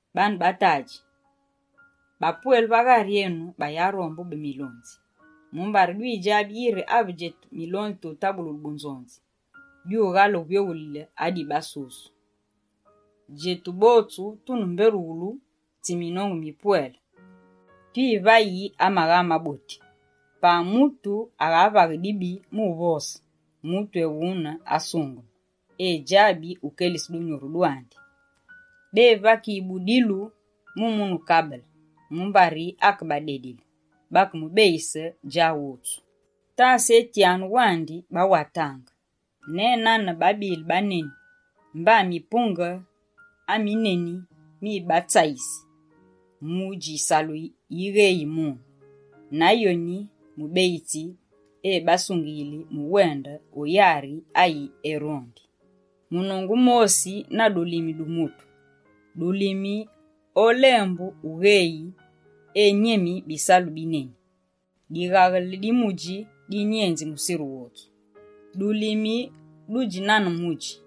Baane ba tadji, bapwele va ghari enu bayarombe ube milonzi, mumbari dwidjabi yiri ave djetu milonzi tutabululu bunzonzi dyughale uvyoghulile adi basusu. Djetu botsu tune mbé rughulu tsi minongu mipwele twivayi amagha maboti. Pa mutu aghavaghe dibi mu uvose, mutu ewune asungeme, edjabi ukelise dunyuru dwandi. Bevakiyi budilu mu munu kabele, mumbari akebadedile, bakemubeyise djawotsu. Tasetyanu wandi bawatange, ne nane babile baneni mba mipunge amineni mibatsayisi, mudji yisalu yigheyi mune, na yoni mubeyitsi ebasungiyili mu uwende o yari ayi erondi. Munongu mosi na dulimi du mutu. Dulimi olembu ugheyi enyemi bisalu bi neni. Dighaghele di mudji dinyenzi musiru wotsu. Dulimi dudji nane mudji.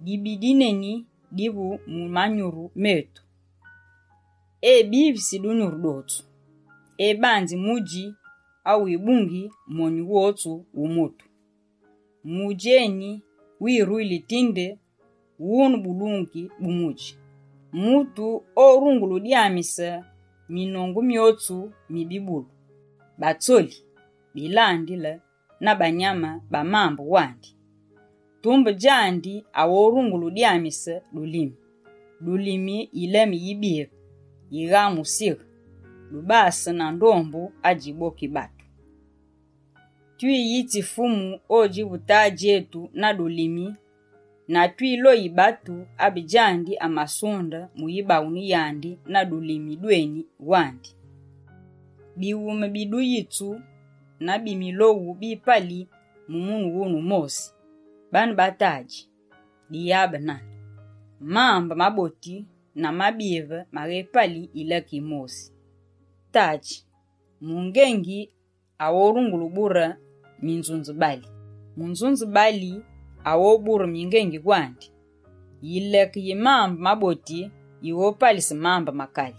Dibi di dineni divu mu manyuru metu. Ebivisi dunyuru dwotsu. Ebanzi mudji awibungi monyu wotsu wu mutu. Mudji eni wiruyili tindi wune bulungi bu mudji. Mutu orungule udyamise minongu myotsu mi bibulu, batsoli, bilandile na banyame ba mambe wandi. Tumbe djandi aghorungule udyamise dulimi. Dulimi yileme yibive yigha musighe. Dubase na ndombu adjiboki batu. Twiyitsi Fumu odjivu Tadji etu na dulimi na twiloghi batu abe djandi amasunde mu yibaghunu yandi na dulimi dweni wandi. Bighume bi duyitsu na bi miloghu bipali mu munu wune wumosi. Baane ba tadji, diyabe nane! Mambe maboti na mabive maghépali yileke yimosi. Baane ba tadji, mungengi orungule ubure minzunzebali? Munzunzibali aghobure mingengi wandi. Yileke yi mambe maboti yighopalise mambe makali.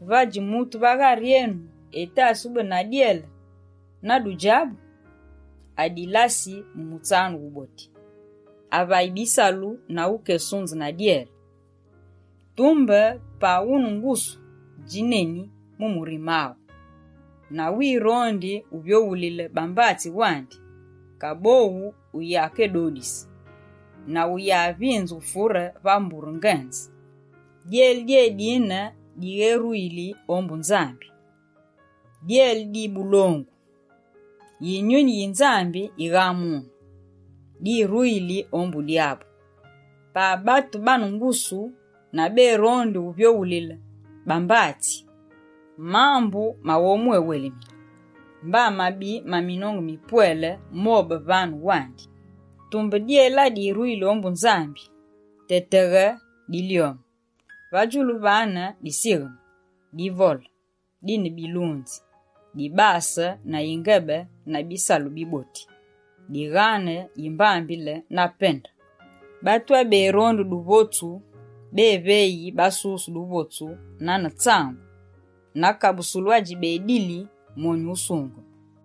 Vadji mutu va ghari enu etasi ube na dyele na dudjabu? Adilasi mu mutsanu wuboti, avayi bisalu na ukesunze na dyele. Tumbe pa wune ngusu djineni mu murime aghu, na wirondi wuvyoghulile ba mbatsi wandi, kaboghu uyakedodise, na uyavinze ufure va mbure ngenze. Dyele dyédine digheruyile ombu Nzambi, dyele di bulongu. Yinyuni yi Nzambi yigha mune, diruyili ombu Dyabu. Pa batu bane ngusu na berondi wuvyoghulile bambatsi, mambu maghomwéwelemine mba mabi ma minongu mipwele mobe vane wandi. Tumbe dyele adiruyili ombu Nzambi tetegha dilyome. Va djulu vane disigheme, divole, dine bilunzi, dibase na yingebe na bisalu biboti. Dighane yimbambile na pende. Batu aberondi duvotsu beveyi basusu duvotsu nane tsangu, na kabusulu adji bedili monyu wusungeme.